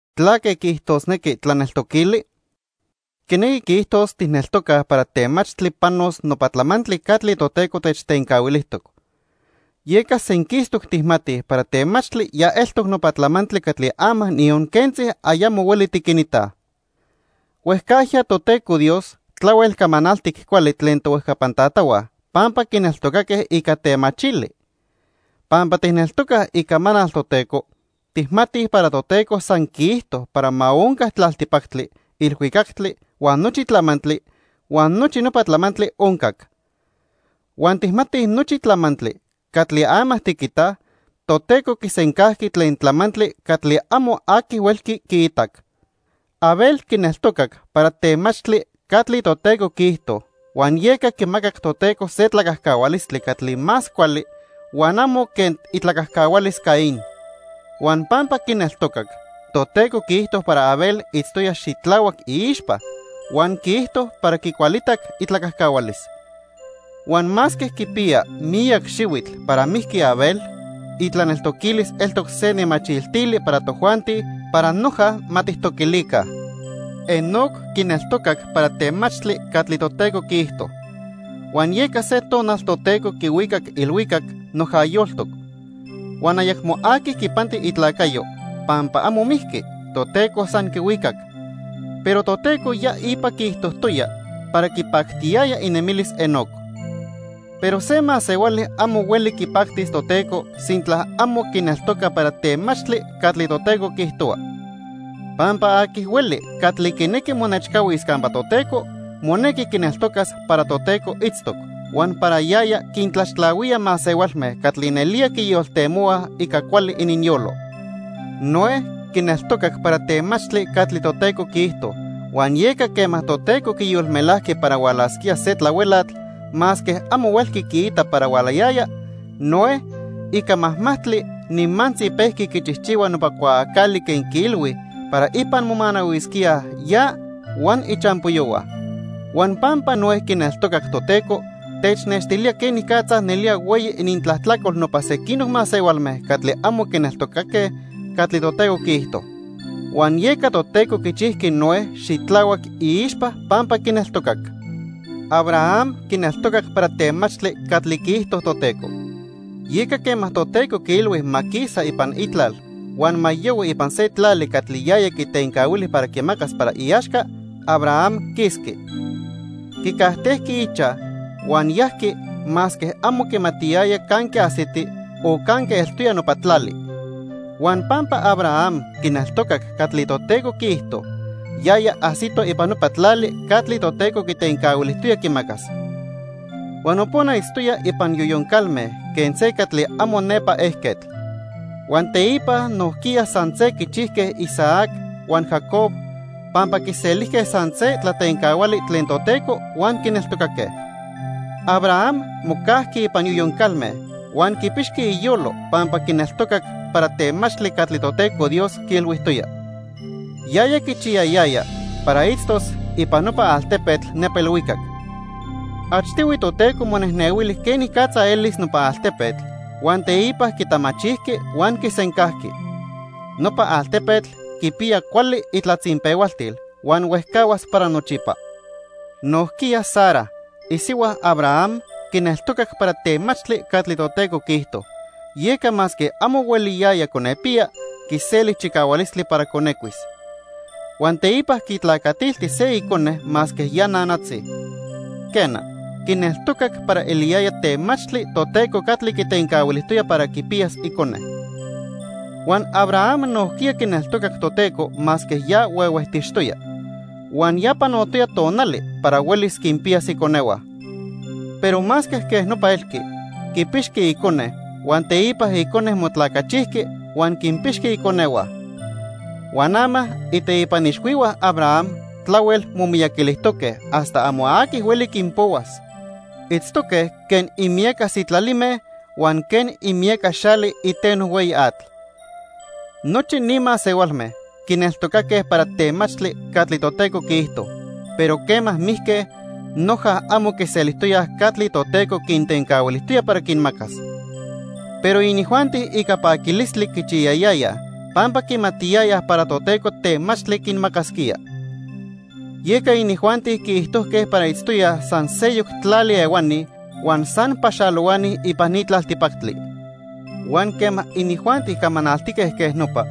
¿Tlaque quiijtosnequi tlaneltoquili? Quinequi quiijtos tijneltocaj para temachtli panos nopa tlamantli catli Toteco techtencahuilijtoc. Yeca senquistoc tijmatij para temachtli ya eltoc nopa tlamantli catli ama niyon quentzi ayamo hueli tiquinitaj. Huejcajya Toteco Dios tlahuel camanaltic cuali tlen tohuejcapan tatahua pampa quineltocaque ica temachili. Pampa tijneltocaj Icamanal Toteco, tijmatij para Toteco san quiijto para ma onca tlaltipactli, ilhuicactli huan nochi tlamantli, huan nochi nopa tlamantli oncac. Huan tijmatij nochi tlamantli catli ama tiquitaj, Toteco quisencajqui tlen tlamantli catli amo aqui huelqui quiitac. Abel quineltocac para temachtli catli Toteco quiijto huan yeca quimacac Toteco se tlacajcahualistli catli más cuali huan amo quen itlacajcahualis Caín. Huan pampa quineltocac, Toteco quiijto para Abel itztoya xitlahuac iixpa, huan quiijto para quicualitac itlacajcahualis. Huan masque quipiya miyac xihuitl para mijqui Abel, itlaneltoquilis eltoc se nemachiltili para tojuanti para noja ma tijtoquilica. Enoc quineltocac para temachtli catli Toteco quiijto, huan yeca se tonal Toteco quihuicac ilhuicac noja yoltoc. Huan ayacmo aqui quipanti itlacayo, pampa amo mijqui, Toteco san quihuicac. Pero Toteco ya ipa quiijtojtoya para quipactiyaya inemilis Enoc. Pero se masehuali amo hueli quipactis Toteco sintla amo quineltoca para temachtli catli Toteco quiijtohua. Pampa aqui hueli catli quinequi monechcahuis campa Toteco, monequi quineltocas para Toteco itztoc, huan para yaya quintlaxtlahuía masehualme catli nelía quiyoltemohuaj ica cuali ininyolo. Noé quineltocac para temachtli catli Toteco quiijto, huan yeca quema Toteco quiyolmelajqui para hualasquía se tlahuelatl masque amo huelqui quiita para hualayaya, Noé, ica majmajtli, nimantzi pejqui quichijchihua nopa cuaacali quen quiilhui para ipan momanahuisquíaj ya huan ichampoyohua. Huan pampa Noé quineltocac Toteco, technextilía quenicatza nelía hueyi inintlajtlacol nopa sequinoc masehualme catli amo quineltocaque catli Toteco quiijto. Huan yeca Toteco quichijqui Noé xitlahuac iixpa pampa quineltocac. Abraham quineltocac para temachtli catli quiijto Toteco. Yeca quema Toteco quiilhui ma quisa ipan itlal huan ma yohui ipan se tlali catli yaya quitencahuili para quimacas para iaxca, Abraham quisqui. Quicajtejqui ichaj huan yajqui masque amo quimatiyaya canque ajsiti o canque eltoya nopa tlali. Huan pampa Abraham quineltocac catli Toteco quiijto, yaya ajsito ipan nopa tlali catli Toteco quitencahuilijtoya quimacas. Huan nopona itztoya ipan yoyon calme quen se catli amo nepa ejquetl. Huan teipa nojquiya san se quichijque Isaac huan Jacob pampa quiselijque san se tlatencahuali tlen Toteco huan quineltocaque. Abraham mocajqui ipan yoyon calme huan quipixqui iyolo pampa quineltocac para temachtli catli Toteco Dios quiilhuijtoya. Yaya quichiyayaya para itztos ipan nopa altepetl nepa ilhuicac. Achtihui Toteco monejnehuili quenicatza elis nopa altepetl huan teipa quitamachijqui huan quisencajqui. Nopa altepetl quipiya cuali itlatzinpehualtil huan huejcahuas para nochipa. Nojquiya Sara, isihua Abraham, quineltocac para temachtli catli Toteco quiijto, yeca masque amo hueliyaya conepiya, quiseli chicahualistli para conecuis. Huan teipa quitlacatilti se icone masque ya nanatzi. Quena, quineltocac para eliyaya temachtli Toteco catli quitencahuilijtoya para quipiyas icone. Huan Abraham nojquiya quineltocac Toteco masque ya huehuejtixtoya huan ya panotoya tonali para huelis quinpiyas iconehua. Pero masque quej nopa elqui, quipixqui icone huan teipa icone motlacachijqui huan quinpixqui iconehua. Huan ama iteipan ixhuihua Abraham tlahuel momiyaquilijtoque hasta amo aqui hueli quinpohuas. Itztoque quen imiyaca sitlalime huan quen imiyaca xali iteno hueyi atl. Nochi ni masehualme quineltocaque para temachtli catli Toteco quiijto, pero quema mijque noja amo quiselijtoyaj catli Toteco quintencahuilijtoya para quinmacas. Pero inijuanti ica paquilistli quichiyayayaj pampa quimatiyayaj para Toteco temachtli quinmacasquía. Yeca inijuanti quiijtojque para itztoyaj san seyoc tlali ehuani huan san paxalohuani ipan ni tlaltipactli. Huan quema inijuanti camanaltique quej nopa,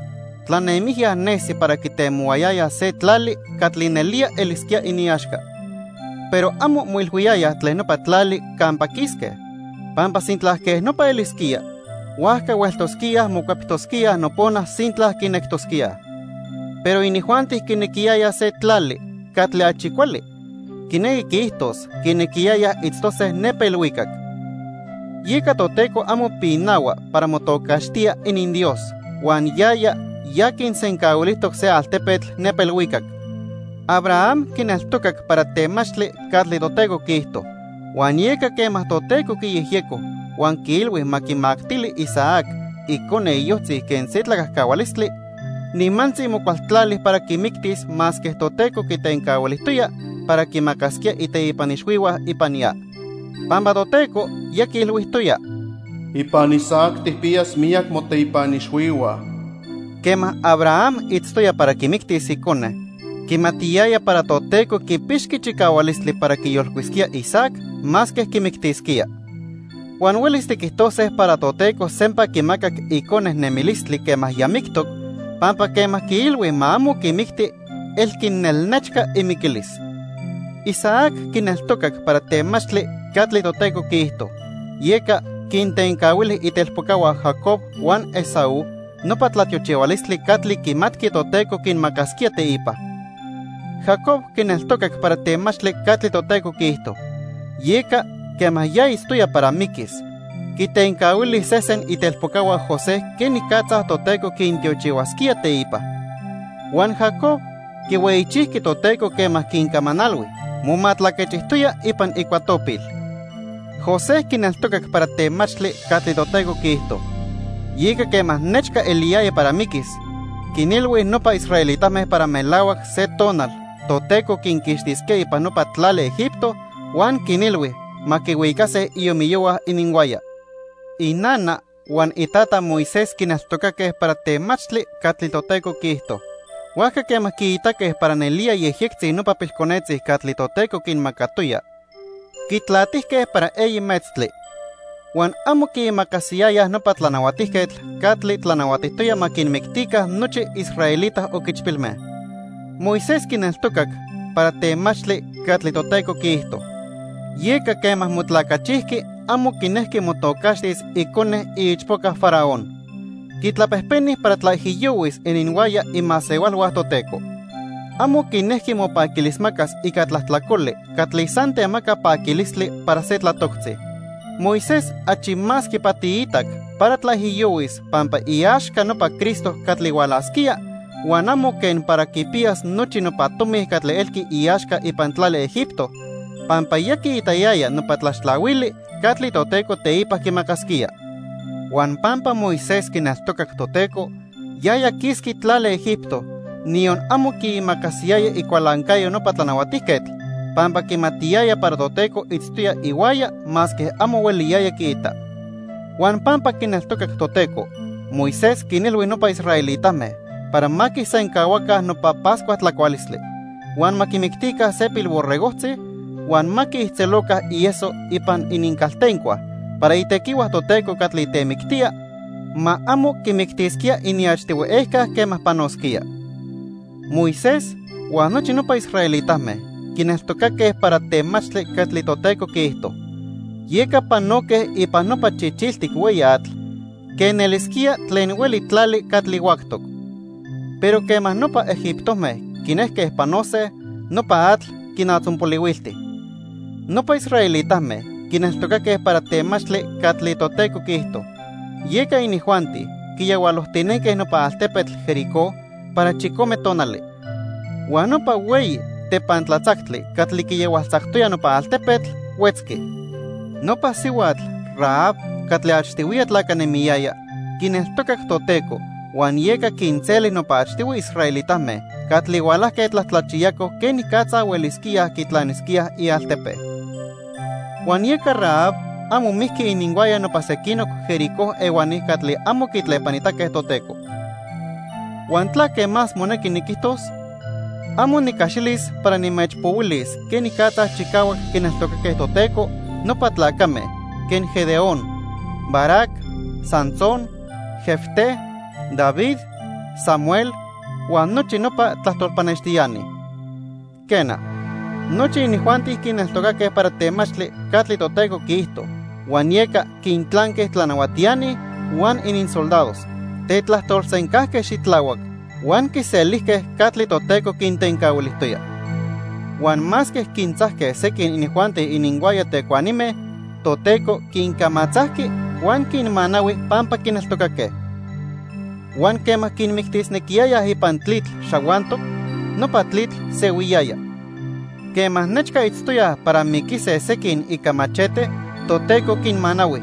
tlanemijya nesi para quitemohuayayaj se tlali catli nelía elisquía iniaxca. Pero amo moilhuiyayaj tlen nopa tlali campa quisque, pampa sintla quej nopa elisquía, huajca hueltosquíaj mocueptosquíaj nopona sintla quinectosquíaj. Pero inijuanti quinequiyayaj se tlali catli achi cuali, quinequi quiijtos quinequiyayaj itztose nepa ilhuicac. Yeca Toteco amo pinahua para motocaxtía ininDios, huan yaya ya quinsencahuilijtoc se altepetl nepa ilhuicac. Abraham quineltocac para temachtli catli Toteco quiijto, huan yeca quema Toteco quiyejyeco huan quiilhui ma quimactili Isaac, icone iyojtzi, quen se tlacajcahualistli, nimantzi mocualtlali para quimictis masque Toteco quitencahuilijtoya para quimacasquía iteipan ixhuihua ipan ya. Pampa Toteco ya quiilhuijtoya: "Ipan Isaac tijpiyas miyac moteipan ixhuihua." Quema Abraham itztoya para quimictis icone, quimatiyaya para Toteco quipixqui chicahualistli para quiyolcuisquía Isaac masque quimictisquía. Huan huelis tiquijtose para Toteco sempa quimacac icone nemilistli quema ya mictoc pampa quema quiilhui ma amo quimicti elqui nelnechca imiquilis. Isaac quineltocac para temachtli catli Toteco quiijto, yeca quintencahuili itelpocahua Jacob huan Esaú nopa tlatiochihualistli catli quimatqui Toteco quinmacasquía teipa. Jacob quineltocac para temachtli catli Toteco quiijto, yeca quema ya itztoya para miquis, quitencahuili sesen itelpocahua José quenicatza Toteco quintiochihuasquía teipa. Huan Jacob quihueyichijqui Toteco quema quincamanalhui, momatlaquechijtoya ipan icuatopil. José quineltocac para temachtli catli Toteco quiijto. Yeca quema nechca eliyaya para miquis, quinilhui nopa israelitame para melahuac se tonal Toteco quinquixtisquía ipan nopa tlali Egipto huan quinilhui ma quihuicase iomiyohua ininhuaya. Inana huan itata Moisés quineltocaque para temachtli catli Toteco quiijto. Huajca quema quiitaque para nelía yejyectzi nopa pilconetzi catli Toteco quinmacatoya, quitlatijque para eyi metztli, huan amo quiimacasiyayaj nopa tlanahuatijquetl catli tlanahuatijtoya ma quinmictica nochi israelita oquichpilme. Moisés quineltocac para temachtli catli Toteco quiijto. Yeca quema motlacachijqui amo quinejqui motocaxtis icone iichpoca Faraón. Quitlapejpeni para tlaijiyohuis ininhuaya imasehualhua Toteco. Amo quinejqui mopaquilismacas ica tlajtlacoli catli san temaca paquilistli para se tlatoctzi. Moisés achi más quipatiitac para tlaijiyohuis pampa iaxca nopa Cristo catli hualasquía huan amo quen para quipiyas nochi nopa tomi catli elqui iaxca ipan tlali Egipto, pampa ya quiitayaya nopa tlaxtlahuili catli Toteco teipa quimacasquía. Huan pampa Moisés quineltocac Toteco, yaya quisqui tlali Egipto, niyon amo quiimacasiyaya icualancayo nopa tlanahuatijquetl, pampa quimatiyaya para Toteco itztoya ihuaya masque amo hueliyaya quiita. Huan pampa quineltocac Toteco, Moisés quinilhui nopa israelitame para ma quisencahuaca nopa Pascua tlacualistli, huan ma quimictica se pilborregojtzi huan ma quiijtzeloca ieso ipan inincaltencua para itequihua Toteco catli temictía, ma amo quimictisquía iniachtihui ejca quema panosquía. Moisés huan nochi nopa israelitame quineltocaque para temachtli catli Toteco quiijto, yeca panoque ipan nopa Chichiltic Hueyi Atl quen elisquía tlen hueli tlali catli huactoc. Pero quema nopa egiptome quinejque panose, nopa atl quinatzonpolihuilti. Nopa israelitame quineltocaque para temachtli catli Toteco quiijto, yeca inijuanti quiyahualojtinenque nopa altepetl Jericó para chicome tonali. Huan nopa hueyi tepantlatzactli catli quiyahualtzactoya nopa altepetl, huetzqui. Nopa sihuatl Rahab catli achtihuiya tlacanemiyaya quineltocac Toteco huan yeca quinseli nopa achtihui israelitame catli hualajque tlajtlachiyacoj quenicatza huelisquíaj quitlanisquíaj ialtepe. Huan yeca Rahab amo mijqui ininhuaya nopa sequinoc Jericó ehuani catli amo quitlepanitaque Toteco. ¿Huan tlaque más monequi niquijtos? Amo nicaxilis para nimechpohuilis quenicatza chicahuac quineltocaque Toteco nopa tlacame quen Gedeón, Barac, Sansón, Jefté, David, Samuel huan nochi nopa tlajtol pannextiani. Quena, nochi inijuanti quineltocaque para temachtli catli Toteco quiijto huan yeca quintlanque tlanahuatiani huan ininsoldados, tetlajtolsencajque xitlahuac, huan quiselijque catli Toteco quintencahuilijtoya. Huan masque quintzajque sequin inijuanti ininhuaya tecuanime, Toteco quincamatzajqui huan quinmanahui pampa quineltocaque. Huan quema quinmictisnequiyayaj ipan tlitl xahuantoc, nopa tlitl sehuiyaya. Quema nechca itztoyaj para miquise sequin ica machete, Toteco quinmanahui.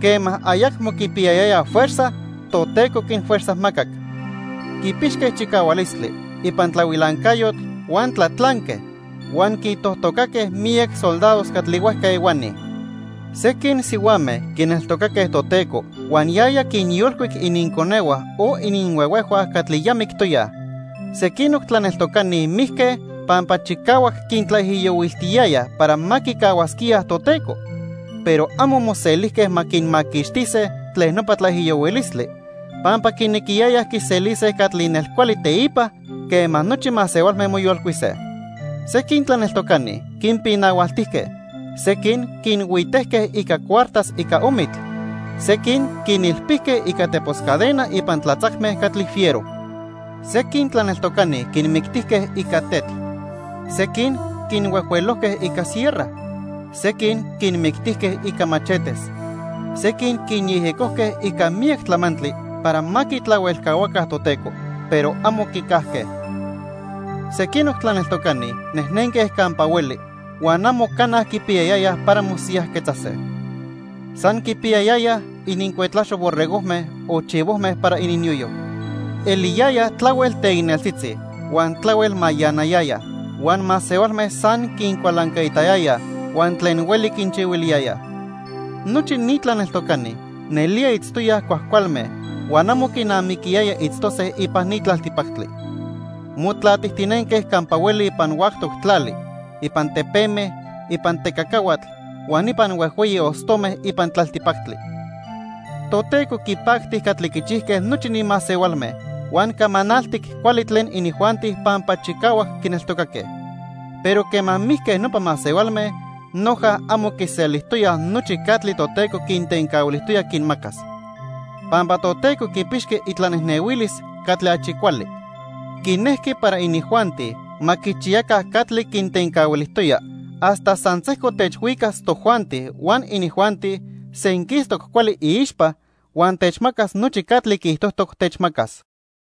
Quema ayacmo quipiyayayaj fuerza, Toteco quinfuerzajmacac. Quipixque chicahualistli ipan tlahuilancayotl huan tlatlanque, huan quintojtocaque miyac soldados catli huejca ehuani. Sequin sihuame quineltocaque Toteco huan yaya quinyolcuic ininconehua o ininhuehuejhua catli ya mictoyaj. Sequinoc tlaneltocani mijque pampa chicahuac quintlaijiyohuiltiyayaj para ma quicahuasquíaj Toteco, pero amo moselijque ma quinmaquixtise tlen nopa tlaijiyohuilistli, pampa quinequiyayaj quiselise catli nelcuali teipa quema nochi masehualme moyolcuise. Sequin tlaneltocani quinpinahualtijque, sequin quinhuitejque ica cuartas ica omitl, sequin quinilpijque ica tepos cadena ipan tlatzacme catli fiero. Sequin tlaneltocani quinmictijque ica tetl, sequin quinhuejhuelojque ica sierra, sequin quinmictijque ica machetes, sequin quinyejyecojque ica miyac tlamantli para ma quitlahuelcahuaca Toteco, pero amo quicajque. Sequinoc tlaneltocani nejnenque campa hueli huan amo cana quipiyayayaj para mosiyajquetzase. San quipiyayaya inincuetlaxo borregojme o chivojme para ininyoyo. Eliyayaj tlahuel teicneltzitzi huan tlahuel mayanayayaj, huan masehualme san quincualancaitayayaj huan tlen hueli quinchihuiliyayaj. Nochi ni tlaneltocani nelía itztoyaj cuajcualme huan amo quinamiquiyaya itztose ipan ni tlaltipactli. Motlatijtinenque campa hueli ipan huactoc tlali, ipan tepeme, ipan tecacahuatl huan ipan huejhueyi ostome ipan tlaltipactli. Toteco quipacti catli quichijque nochi ni masehualme huan camanaltic cuali tlen inijuanti pampa chicahuac quineltocaque, pero quema mijque nopa masehualme, noja amo quiselijtoyaj nochi catli Toteco quintencahuilijtoya quinmacas. Pampa Toteco quipixqui itlanejnehuilis catli achi cuali. Quinejqui para inijuanti ma quichiyaca catli quintencahuilijtoya hasta san sejco techchihuas tojuanti huan inijuanti senquistoc cuali iixpa huan techmacas nochi catli quiijtojtoc techmacas.